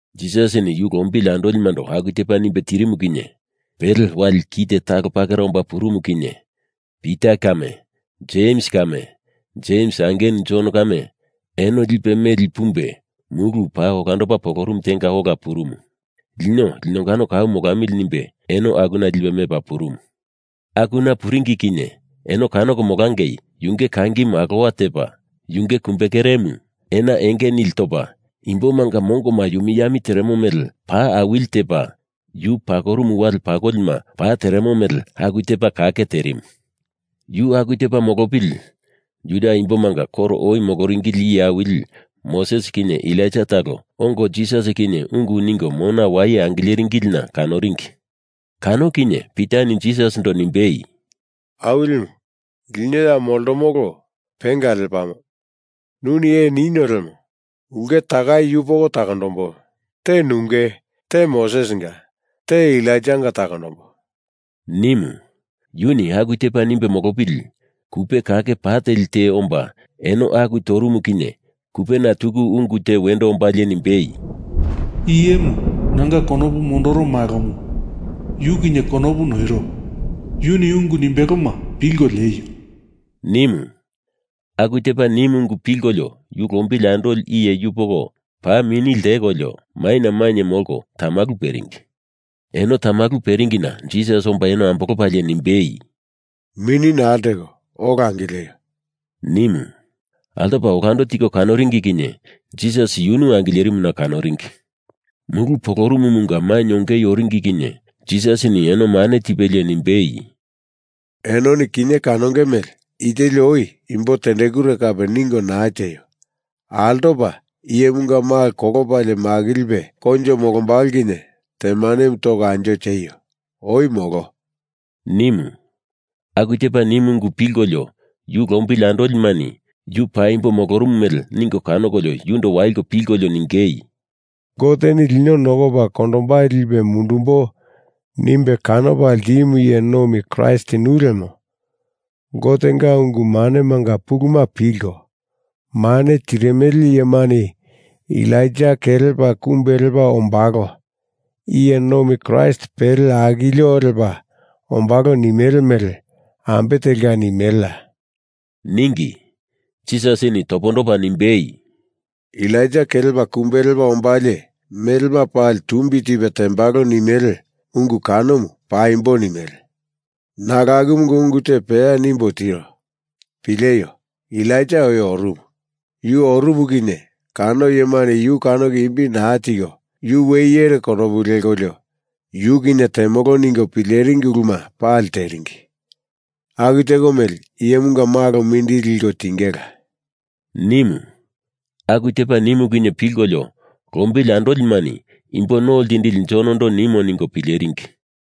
Jisasini yu lombili andolimando aku tepa nimbe tirimu kinye pele wali kite talo pakera omba purumu kinye Pita kame Jems kame Jems angenu Jon kame eno lipe meli pumbe mulu paa olandopa polorumu tenga ola purumu. Lino linongano kau molamili nimbe eno akuna lipe mepa purumu. Akuna puringi kinye eno kanoko molangei yunge kangimu alowa tepa, yunge kumbekeremu ena enge nili topa imbomanga mongo yumi yami teremo mele pa awili tepa, yu pakorumu wale pakolima pa teremo mele aku tepa kake terimu. Yu aku tepa molopili, Juda imbomanga koro oi moloringili iye awili Moses kinye Elaija talo ongo Jisas kinye ungu ningo mona waye angileringilina kanoringi. Kano kinye Pitani Jisasindo nimbei, “Awilimu, lino ya moltomolo penga lepamo. Nuni ee ninio lemo, ulke takai yupoko takondombo. Te nunge, te Mosesinga, te Elaijanga takondombo,” nimu. Yuni aku tepa nimbe molopili kupe kake pa teli te omba eno aku torumu kinye kupena tuku ungu te wendo ombalie nimbei, “I iyemu nanga konopu mondoro Malomu. Yu kinye konopu noiro. Yuni ungu nimbeloma pilko lieio,” nimu. Aku tepa nimu ungu pilkolio yu lombili andoli iye yupoko paa mini ltekolio maina mainye molko tamalu peringi. Eno tamalu peringina Jisas omba eno ambolopalie nimbei, “Mini naa lteko ola angileio,” nimu. Altopa olando tiko kanoringi kinye Jisas yunu angilerimuna kanoringi. Mulu polorumumunga mainye ongei oringi kinye Jisasini eno mane tipelie nimbei, “Enoni kinye kanonge mele i teli oi imbo tendekure kape ningo naa tieio. Altopa, Iyemunga Malo kolopalie makilipe koinjo molombalo kinye temanemu toko anjo tieio. Oi molo!” nimu. Aku tepa nimu ungu pilkolio yu lombili andolimani yu paimbo molorumu mele ningo kanokolio yundo waliko pilkolio ningei, “Goteni lino nokopa kondombai lipe mundumbo nimbe kanopa ltimu iye nomi Kraist nu lemo Gotenga ungu manemanga puluma pilko mane tirimele iyemani Elaija kelepa kumbe lepa ombalo, iye nomi Kraist pele akilio lepa ombalo nimele mele ambe telka nimeleya?” ningi. Jisasini topondopa nimbei, “Elaija kelepa kumbe lepa ombalie melema pali tumbi tipe tembalo nimele ungu kanomu paimbo nimele. Nalo akumunga ungu te peya nimbo tiro. Pileio. Elaija oi orumu. Yu orumu kinye kano iyemani yu kanoko imbi naa tiko yu we iyere konopu lekolio yu kinye temolo ningo pileringi uluma pali teringi. Aku teko mele Iyemunga Malo mindili liko tingela,” nimu. Aku tepa nimu kinye pilkolio lombili andolimani Imbo No Ltindili Jonondo nimo ningo pileringi.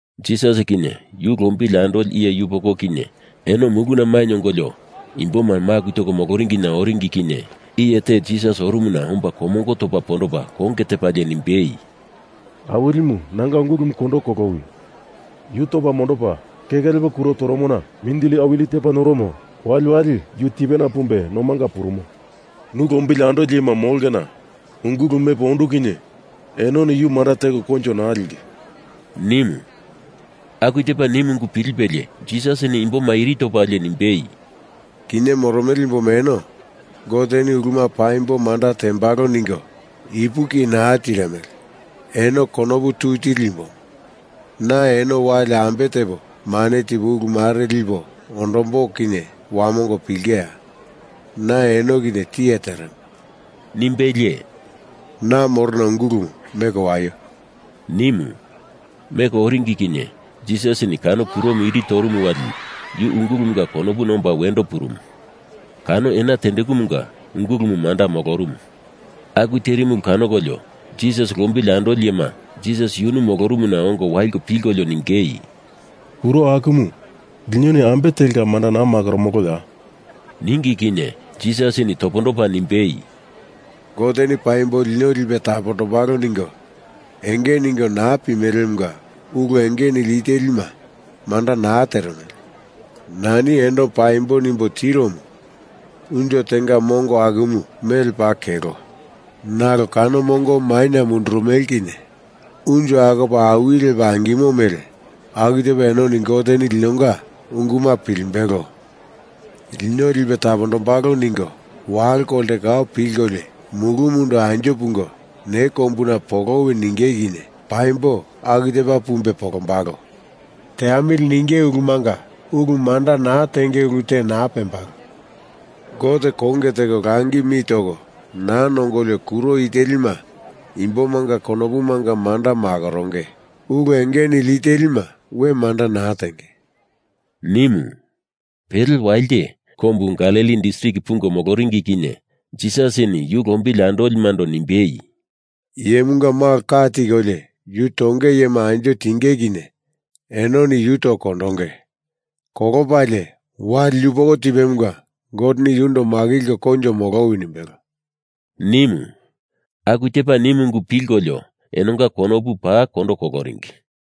Jisas kinye yu lombili andoli iye yupoko kinye eno muluna mainye ongolio imboma maku toko moloringina oringi kinye iye te Jisas orumuna omba komongo topa pondopa konge tepalie nimbei, “Awilimu, nanga ungulumu kondo kolowi. Yu topa mondopa keke lepo kuro toromona mindili awili tepa noromo. Waliwali yu tipena pumbe nomanga purumo. Nu lombili andoli iyema molongena ungulumu mepo ondu kinye enoni yu manda teko koinjo naa linge,” nimu. Aku tepa nimu ungu pilipelie Jisasini imboma iri topalie nimbei, “Kinye moromele imboma eno Goteni uluma paimbo manda tembalo ningo ipuki naa tirimele. Eno konopu tui tili imboma, na eno wali ambe tepo mane tipo ulu mare lipo ondombo kinye wamongo pilingeya? Na eno kinye tiye teremo,” nimbelie “Na morona ungulumu meko waio,” nimu. Meko oringi kinye Jisasini kano kuromu iri torumu wali yu ungulumunga konopuna omba wendo purumu. Kano ena tendekumunga ungulumu manda molorumu. Aku terimu ulu kanokolio Jisas lombili andoli iyema Jisas yunu molorumuna ongo waliko pilkolio ningei, “Kuro akumu linoni ambe telka manda naa makoromoloya?” ningi kinye Jisasini topondopa nimbei, “Goteni paimbo lino lipe tapombalo ningo enge ningo naa pimelemunga ulu enge nili i telima manda naa teremele. Nani eno paimbo nimbo tiromu, unjo tenga mongo akumu mele paa kelo nalo kano mongomu maina mundurumele kinye unjo akopa awili lepa angilimo mele, aku tepa enoni Goteni linonga unguma pilimbelo, lino lipe tapombalo ningo walo kolte kau pilkolio mulumundo anjo pungo ne kombuna polowi ninge kinye paimbo aku tepa pumbe polombalo. Teamili ninge ulumanga ulu manda naa tenge ulu te naa pembalo. Gote konge teko langi mi toko naa nongolio kuro i telima imbomanga konopumanga manda makoronge. Ulu enge nili i telima we manda naa tenge,” nimu. Pele walite, kombu Galili distrik pungo moloringi kinye Jisasini yu lombili andolimando nimbei, “Iyemunga Malo ka tikolio yu tonge iyema anjo tinge kinye enoni yu toko kondonge. Kolopalie, wali yupoko tipemunga Goteni yundo makilko koinjo molowi nimbelo,” nimu. Aku tepa nimu ungu pilkolio enonga konopu paa kondo koloringi.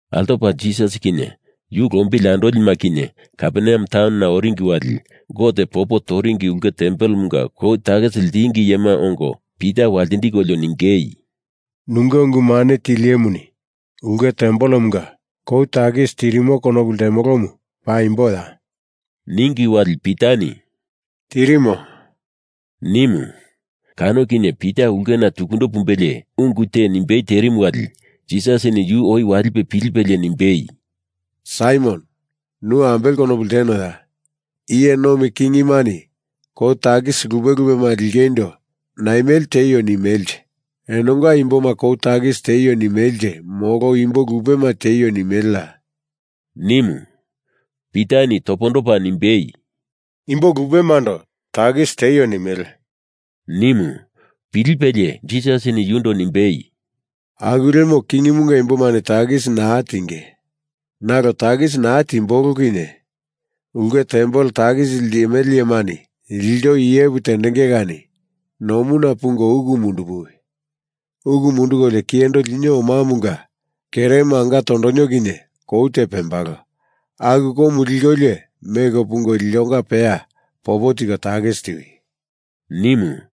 Altopa Jisas kinye yu lombili andolima kinye Kaperneam taunona oringi wali Gote popo toringi ulke tempelemunga kou takisi ltingi iyema ongo Pita waltindikolio ningei, “Nunge ungu mane tili iyemuni ulke tempelemunga kou takisi tirimo konopu ltemolomu, paimboya?” ningi wali Pitani “Tirimo,” nimu. Kano kinye Pita ulkena tukundo pumbelie ungu te nimbei terimu wali Jisasini yu oi walipe pilipelie nimbei, “Saimon, nu ambele konopu ltenoya? Iye nomi kingimani kou takisi lupe lupema lingeindo naimele tieio nimelenje? Enonga imboma kou takisi tieio nimelenje molo Imbo lupema tieio nimeleya?” nimu. Pitani topondopa nimbei, “Imbo lupemando takisi tieio nimele,” nimu. Pilipelie Jisasini yundo nimbei, “Aku lemo kingimunga imbomani takisi naa tienge. Nalo takisi naa timbolo kinye ulke tempel takisi limele iyemani ilto iyepu tendenge kani nomuna pungo uku mundupuwi. Uku mundukolio kiyendo linio omamunga keremu anga tondonio kinye kou te pembalo, aku koumu likolio meko pungo iltonga peya popo tiko takisi tiwi,” nimu.